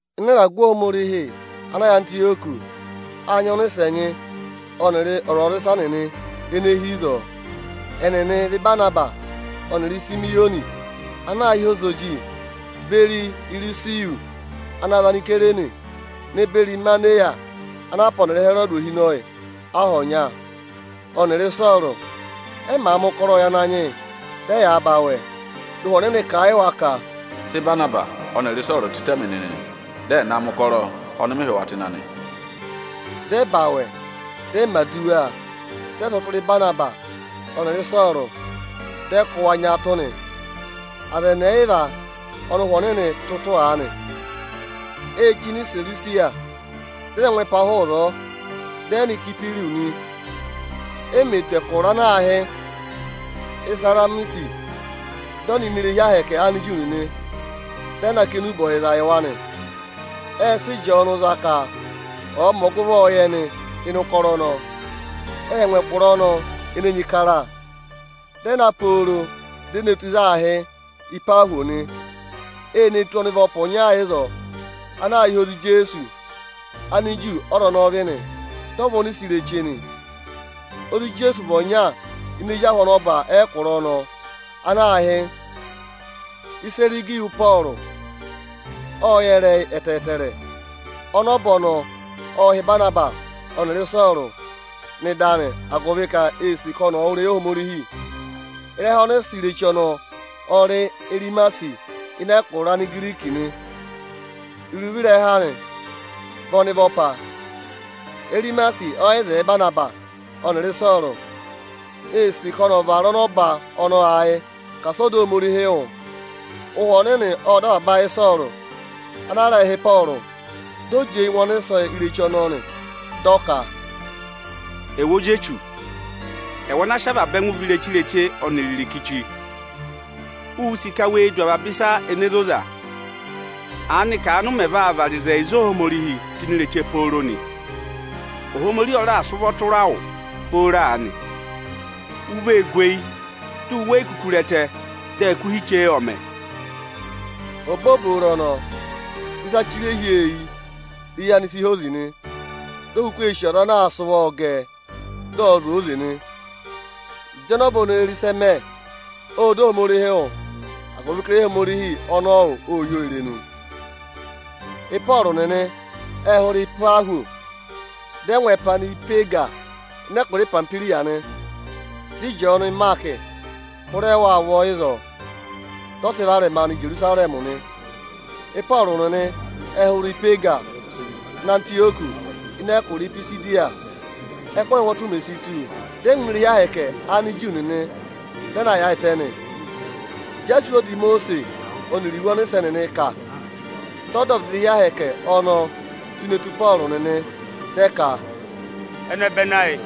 Ịnị ịragụ Ohomorihi ana yà Antịyọkị â nyị ọnịsẹ ẹnyị ọnịrị ọzwọzịsa nịnị ene hi ịzọọ. Ẹnịnị ẹ vị Ịbanabasị ọnịrị Isimiyọnị ana aā hị́ Ozoji, beri Irusiyọsị ana vị Anisayireni, ne beri Imaneya ana a pá ọnịrị Ịhẹrọdị ohinọyị aha ọnya, ọnịrị Ịsọọrụ. Ẹ màa mẹ ụkọrọọ yị Ananyị yị, dị ẹyaa za awẹ, dị Ụhwẹ Ọnịnị kà a yị wa ka, “Sị Ịbanabasị ọnịrị Ịsọọrụ tịtẹ mị nịnị, dị ẹ̀ na mẹ̀ ụkọrọ ọnị mị hị́ wa tụ́ ịnị anị!” Dị ẹ za awẹ, dị ẹ mẹ̀ aduwa, dị ẹ sị ụvọ tụra Ịbanabasị ọnịrị Ịsọọrụ, dị ẹ kụ́ wa nyaatụ nị. Aza ẹnị ẹyịva ọnị Ụhwẹ Ọnịnị tụ́ ụtụ aanị, ê chí nọ Iserusiya, dị ẹ na ngụ ẹpa hụụ ịzọọ, dị ẹ nọ Ịsayịpịrụsị nị. E mè tù ẹkụra ana aā hị́ Isaramisi, dị ẹ nọ ini irehi Ohomorihi Aniju nịnị, dị ẹ na kà enube ọyịza yị wa nị. Ệ sị Ịjọọnụ za ka ọ̀ọ mẹ ọgụvọọ yị ẹnị ịnị ụkọrọ ọnọọ. Ệ ngụ ẹkụra ọnọọ ene enyi kara, dị ẹ na pooro di e ne tù ịzị aā hị́ Ịpahwọsị nị. E ne tù ọnịvọpa ọnya ịzọọ ana aā hị́ Ozi Ijeesu. Aniju ọ́za ọnọọ vị nị; dị ọ vị ọnịsẹ ireche nị. Ozi Ijeesu vị ọnya ini ezi ahụ ọnọba ẹkụra ọnọọ ana aā hị́ Ịsagịyọsị Ịpọọrụ. Ộ yẹ ịrẹyị ẹtẹẹtẹrẹ. Ọnọba ọnọọ ộ hị́ Ịbanabasị ọnịrị Ịsọọrụ nọ ịdị anị, agụvị ka ee sì ka ọnị ọ̀ wụ́ ịrẹyị Ohomorihi. Ịrẹha ọnịsẹ ireche ọnọọ ọ rị Erimasi ịnị ẹkụra Anigiriki nị; iruvo ịrẹha anị vị ọnịvọpa. Erimasi ọ yị zẹẹ Ịbanabasị ọnịrị Ịsọọrụ; ee sì ka ọnị ọ̀ vara ọnọba ọnọọ ayị ka asị ọ dọ Ohomorihi wụ́. Ụhwẹ Ọnịnị ộ dọ avaba ayị Ịsọọrụ ana a rẹẹ̄ hị́ Ịpọọrụ. Dị ọ jị eyi ngụ ọnịsẹ ireche ọnọọ nị. Dị ọ ka, “Ẹwụ ozi Echu, ẹwụ ana sị avaba ẹngụ vị ireche-ireche ọnịrị irikichi, uū sì ka we du avaba ịsa ene zoza. Aanị ka aanị ụ mẹ̀ vaa vara ịzẹyịza Ohomorihii tụ́ ini ireche pooro nị? Ohomorihi ọ raà sị ụvọ tụra wụ booro aanị, u vee gu eyi, di u we yi kuku re ẹtẹ dị ẹkụhị che ọ̀ mẹ.” Obooboro ọnọọ, dị ịsa chire hi ọọ eyi, dị eyi anị si hozi nị. Di o kuku ee sì ọza anaa sị ụvọọ gẹ ẹ, dị ọ̀ọ zụ̀ ọọ oze nị. Ịjị ọnọba ọnọọ re ịsị ẹ mẹ, ộ dọ Ohomorihi wụ́, agụvị ka ịrẹyị Ohomorihi ọnọọ wụ́ ô hí oo irenu. Ịpọọrụ nịnị ệ hụrẹ Ịpahwọsị, dị ẹ ngụ ẹpa nọ Ipeega ịnị ẹkụra Ipamihwiriya nị. Dị Ịjọọnụ Ịmaakị hụrẹ wa ụvọ ịzọọ, dị ọ sị varẹma nọ Ijerusarẹmị nị. Ịpọọrụ nịnị ệ hụrẹ Ipeega nọ Antịyọkị ịnị ẹkụra Ipisidiya. Ẹ́kụhị ụhwọtụ mè si tù, dị ẹ ngụ ini irehi Ohomorihi Aniju nịnị, dị ẹ na yaayịtẹ nị. Ịjị a sị iwe ọda Imosiisi ọnịrị iwe ọnịsẹ nịnị kà, dị ọdọvịdị irehi Ohomorihi ọnọọ tụ́ ne tù Ịpọọrụ nịnị, dị ẹ ka, “Ẹnẹbẹnị ayị,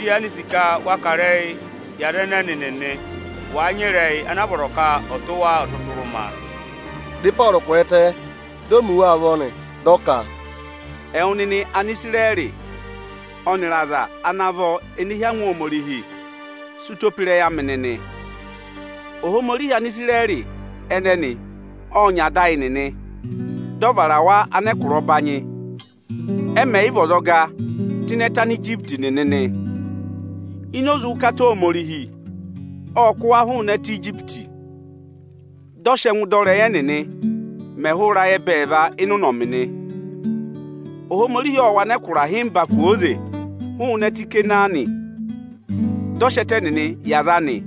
ị yaanị sì ka wa kà ịrẹyị yị aza ẹnẹnị nịnị, wàa nyị ịrẹyị ana a vọrọ ka ọ̀ tụ́ wa ọtụtụrụma.” Dị Ịpọọrụ kwẹẹtẹ, di o mi wa ụvọ nị, dị ọ ka, “Ẹwụ nịnị Anisirẹrị ọnịrị aza ana vọ ene hí angwa Ohomorihi, sị ụtọ pe ịrẹyị amị nịnị! Ohomorihi Anisirẹrị ẹnẹnị ộ nyị ada ayị nịnị, dị ọ vara wa anẹkụra ọbanyị, ẹ mẹ̀ yị vị ọzọga tụ́ ịnị ẹtẹ Anijipiti nịnị nị. Ini oze ụkata Ohomorihi ộ kụ́ wa hụụnị ẹtẹ Ijipiti. Dị ọ sị ẹngụ dọ ịrẹyị ẹnịnị mẹ ẹhụụ ịrayị ẹbẹẹva ịnị ụnọmị nị. Ohomorihi ộ wụ anẹkụra ịhịmba kwooze hụụnị ẹtẹ Ikanaani, dị ọ sị ẹtẹ ẹnịnị yị aza anị,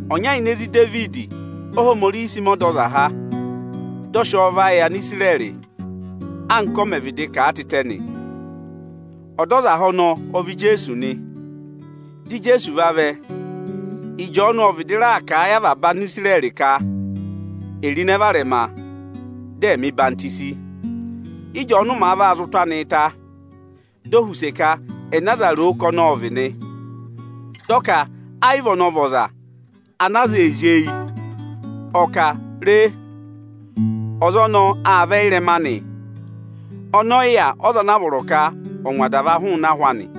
Ọnya ini ezi Idevidi Óhomorihi sị mẹ ọdọzaha, dị ọ sị ọọ va yị Anisirẹrị, anka ọ mẹ̀ vịdị kà a tịtẹ nị. Ọdọzaha ọnọọ ọ vị Ijeesu nị. Dị Ijeesu vavẹ, Ịjọọnụ ộ vịdị raà kà a yị avaba Anisirẹrị ka è ro ịnẹ varẹma, dị ẹ̀ mẹ̀ ọyịhwọzenyi. Ị́jọọnụ màa vaa zị ụtụ anịị ta, di o họ̀ use ka ẹnẹ aza ro ka ọnị ộ vị nị. Dị ọ ka ẹ yị vị ọnị vị ọza ana aza ee zí eyi. Ọ kà, Re! Ọza ọnọọ aa vẹ ịrẹma anị, ọnị ọ yị yà ọza ana a vọrọ ka ọ̀ ngwa adava hụụnị ahụ anị.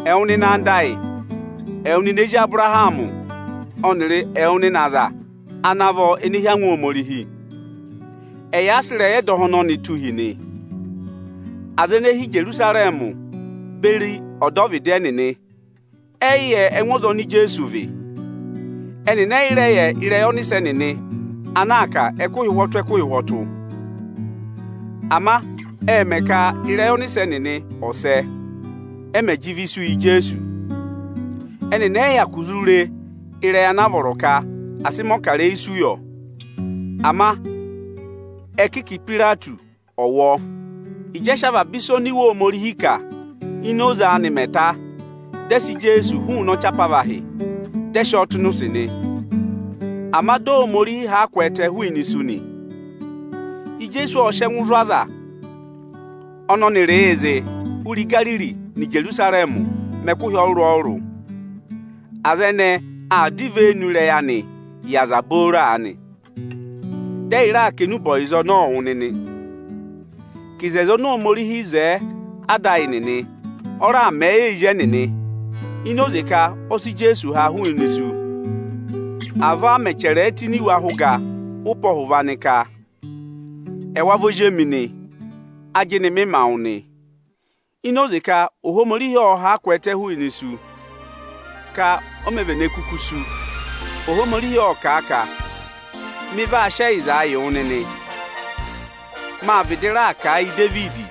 Ẹwụ nịnị anda ayị, ẹwụ nịnị ezi Abụrahamị, ọnịrị ẹwụ nịnị aza ana vọ ene hí angwa Ohomorihi, ẹyị a sị ịrẹyị ẹdọha ọnọnị tụ́ hi nị. Aza ene hi Ijerusarẹmị beri ọdọvịdị ẹnịnị ẹ yị yẹ ẹngụ ọza oni Ijeesu vị. Ẹnịnị ẹ yị rẹ yẹ ịrẹyị ọnịsẹ nịnị ana aa kà ẹkụhị ụhwọtụ-ẹkụhị ụhwọtụ. Ama ệ mẹ ka ịrẹyị ọnịsẹ nịnị ọ̀ sẹ, ẹ mẹ̀ jị ịvị isu yị Ijeesu. Ẹnịnị ẹ yị hyakụ zụ re ịrẹyị ana a vọrọ ka à sị mẹ̀ ọkarẹyị isu yọ, ama ẹ kị ka Ipayireti ọ̀ wụ ọọ. Ịjị ẹ sị avaba ịsa oni Iwe Ohomorihi kà ini oze anị mẹ ta, dị ẹ sị Ijeesu hụụnị ọchị apavahị, dị ẹ sị ọọ tụ́ ịnị ụsị nị. Ama dị Ohomorihi ha a kwẹẹtẹ hụụnị isu nị. Ijeesu ộ sị ẹngụ zụ̀ aza ọnị ọnịrịị̄ zịị hụrẹ Igariri nọ Ijerusarẹmị mẹ ẹkụhị ọrụrụ-ọrụrụ. Aza ẹnẹẹ aa dọ ivenu ịrẹyị anịị yị aza booro aanị. Dị ẹyị raa kà enube ọyịzaa wụ nịnị, ka oto oni Ohomorihi wo yị ada ayị nịnị, ọ raà mẹ̀ ẹ yị ẹyị ezi ẹnịnị, ini oze ka ọ sị Ijeesu ha hụụnị isu. Avọọ a mẹ̀ chẹrẹ ẹ tụ́ ini iwe ahẹ ụga ụpẹ ọhụva nị ka: ‘Ẹwa vị Ozi emi nị. Ajịnị mị ma wụ nị.’ Ini oze ka Ohomorihi ộ ha a kwẹẹtẹ hụụnị isu, ka o mē vene kuku sú, Ohomorihi ộ kà a ka: ‘Mị vaa sị ẹyịza yị wụ nịnị. Mâ vịdị raà kà a yị Idevidi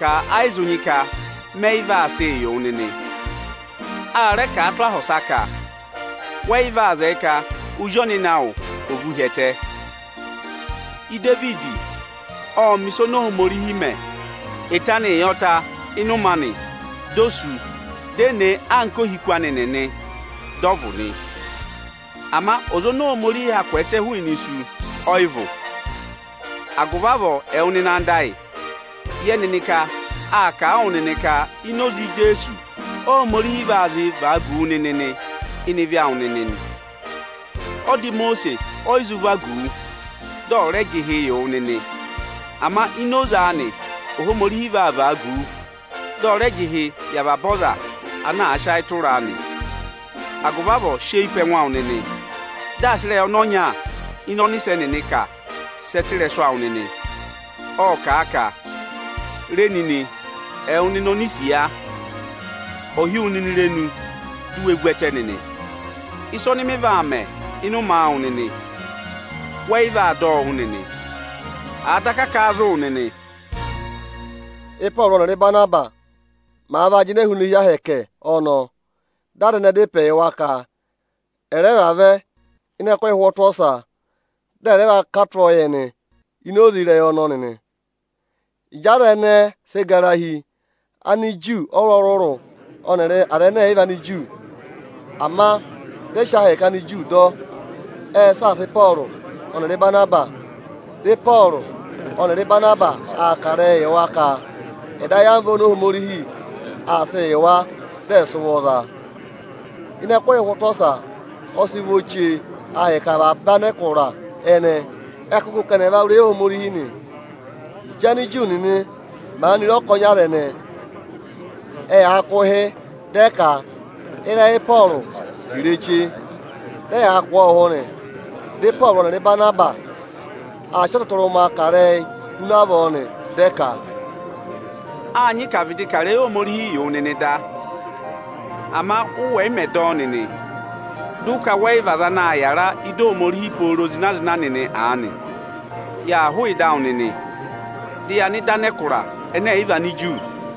ka ẹ yị zụ nyị ka mẹ yị vaa sịị yị wụ nịnị.’ A rẹ kà a tụ́ aha ọsa ka: ‘Wẹ yị vaa zẹẹ ka Ọza Ọnịnị awụ ọ̀ vụ̀ hi ẹtẹ.’ “Idevidi ộ mẹ̀ ịsa oni Ohomorihi mẹ̀ eto anịị yọ ta ịnị ụmẹ anị, di o sú, di e ne e anka ohiku anị nịnị, dị ọ vụ̀ nị. Ama ọza oni Ohomorihi ha kwẹẹtẹ hụụnị isu, ọ yị vụ̀. Agụvị avọọ, ẹwụ nịnị anda ayị, yẹ nịnị ka â kà a wụ nịnị ka ini oze Ijeesu Óhomorihi vaa zịị vagu wu nịnị ịnị ịvị awụ nịnị nị. Ọda Imosiisi ọ yị zụ vagu wu, dị ọ̀ rẹ jị ịhị yị wụ nịnị. Ama ini oze anị Óhomorihi zị vagu wu, dị ọ rẹ jị ịhị yị avaba ọza ana àa sị ayị tụra a nị. Agụvị avọọ sị eyi pe ẹngụ awụ nịnị, dị asị ịrẹyị ọnị ọnya ịnị ọnịsẹ nịnị kà sẹ tụ́ ịrẹsụ awụ nịnịị. Ộ kà a ka, “Re nịnị, ẹwụ nịnị onisiya, Ò hí wu nịnị irenu, di u we vu ẹtẹ nịnị! Ịsa ọnị mị vaa mẹ ịnị ụmẹ awụ nịnị, wẹ yị vaa dọ ọ wụ́ nịnị, àa daka kà a zụ̀ wụ nịnị.” Ị́pọọrụ ọnịrị Ịbanabasị màa vaa jịnẹẹ hụụnị irehi Ohomorihi ọnọọ, dị aza ẹnẹẹ dá ịpẹ yị wa ka ẹ̀ rẹ vavẹ ịnị ẹkụhị ụhwọtụ ọsa, dị ẹ̀ rẹ va kà tụ́ ọọ yị ẹnị ini oze ịrẹyị ọnọnị nị. Ịjị aza ẹnẹẹ sị gara hi, Aniju ọrụrụ-ọrụrụ ọnịrị Anigiriki, ama dị ẹ sị ahẹkẹ Aniju dọ, ệ saasa Ịpọọrụ ọnịrị Ịbanabasị. Dị Ịpọọrụ ọnịrị Ịbanabasị aa kà ịrẹyịị yị wa ka ẹ̀ dọ ayamva oni Ohomorihi aa sịị yị wa, dị ẹ̀ sị ụvọ za a. Ịnị ẹkụhị ụhwọtụ ọsa, ọ sị vọ chee ahịka avaba anẹkụra ẹnẹẹ ẹ kụ́ gụ ka ẹnị ẹ̀ va wụ́ ịrẹyị Ohomorihi nị. Ịjị Aniju nịnị maanị re ọkọnị aza ẹnẹẹ, ẹyaa kụ̀ ụhị dị ẹ ka, ịrẹyị Ịpọọrụ vị ireche, dị ẹya kụ̀ ọọ ụhụ nị. Dị Ịpọọrụ ọnịrị Ịbanabasị aa sị ọtụtụrụma kà ịrẹyị huna avọọ nị. Dị ẹ ka, “Â nyị ka à vịdị kà ịrẹyị Ohomorihi yị wụ nịnị da. Ama ụ wẹ̀ yị mẹ̀ dọ ọ nịnị, dị ụ ka wẹ yị vị aza ana aa yàra ị́dị Ohomorihi pooro zịna-zịna nịnị aanị, yaa hụụ ịdị awụ nịnị, dị ya nọ ịdị anẹkụra ẹnẹ ẹ̀ yị vị Aniju.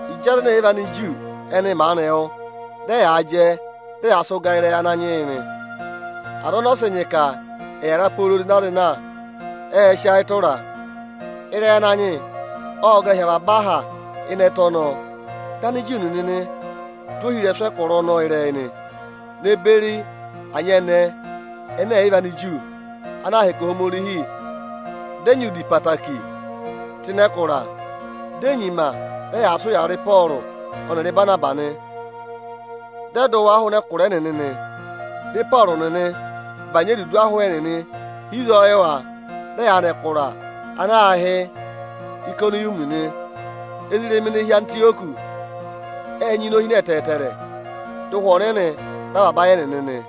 Ịjị Anigiriki ẹnị maanị wụ́, dị ẹyaa jẹ, dị ẹyaa sị ụgaa yị ịrẹyị Ananyị yị nị. Aza ọnị ọ sị nyị ka ẹ̀ yàra pooro zịna-zịna, ệ sị ayị tụra a. Ịrẹyị Ananyị yị ộ gara hi avaba aha ịnị ẹtẹ ọnọọ. Dị Aniju nịnị tụ́ ohirẹsụ ẹkụra ọnọọ ịrẹyị nị, ne beri anyẹnẹẹ ẹnẹ ẹ̀ yị vị Aniju, ana aa hẹkẹ Ohomorihi dị ẹ nyị udi ẹtẹẹtẹrẹ tụ́ ịnị ẹkụra. Di e nyima dị ẹyaa sị ụyaa rị Ịpọọrụ ọnịrị Ịbanabasị nị. Dị ẹ dụ wa hụụnị ẹkụra ẹnịnị nị. Dị Ịpọọrụ nịnị bànyị edudu ahụ ẹnịnị hi ịzọọ yị wa, dị ẹyaa nọ ẹkụra ana aā hị́ Ayịkọnịyọmị nị. Ezirẹma ene hi Antịyọkị ệ nyị inohine ẹtẹẹtẹrẹ. Dị Ụhwẹ Ọnịnị dọ avaba ayị ẹnịnị nị.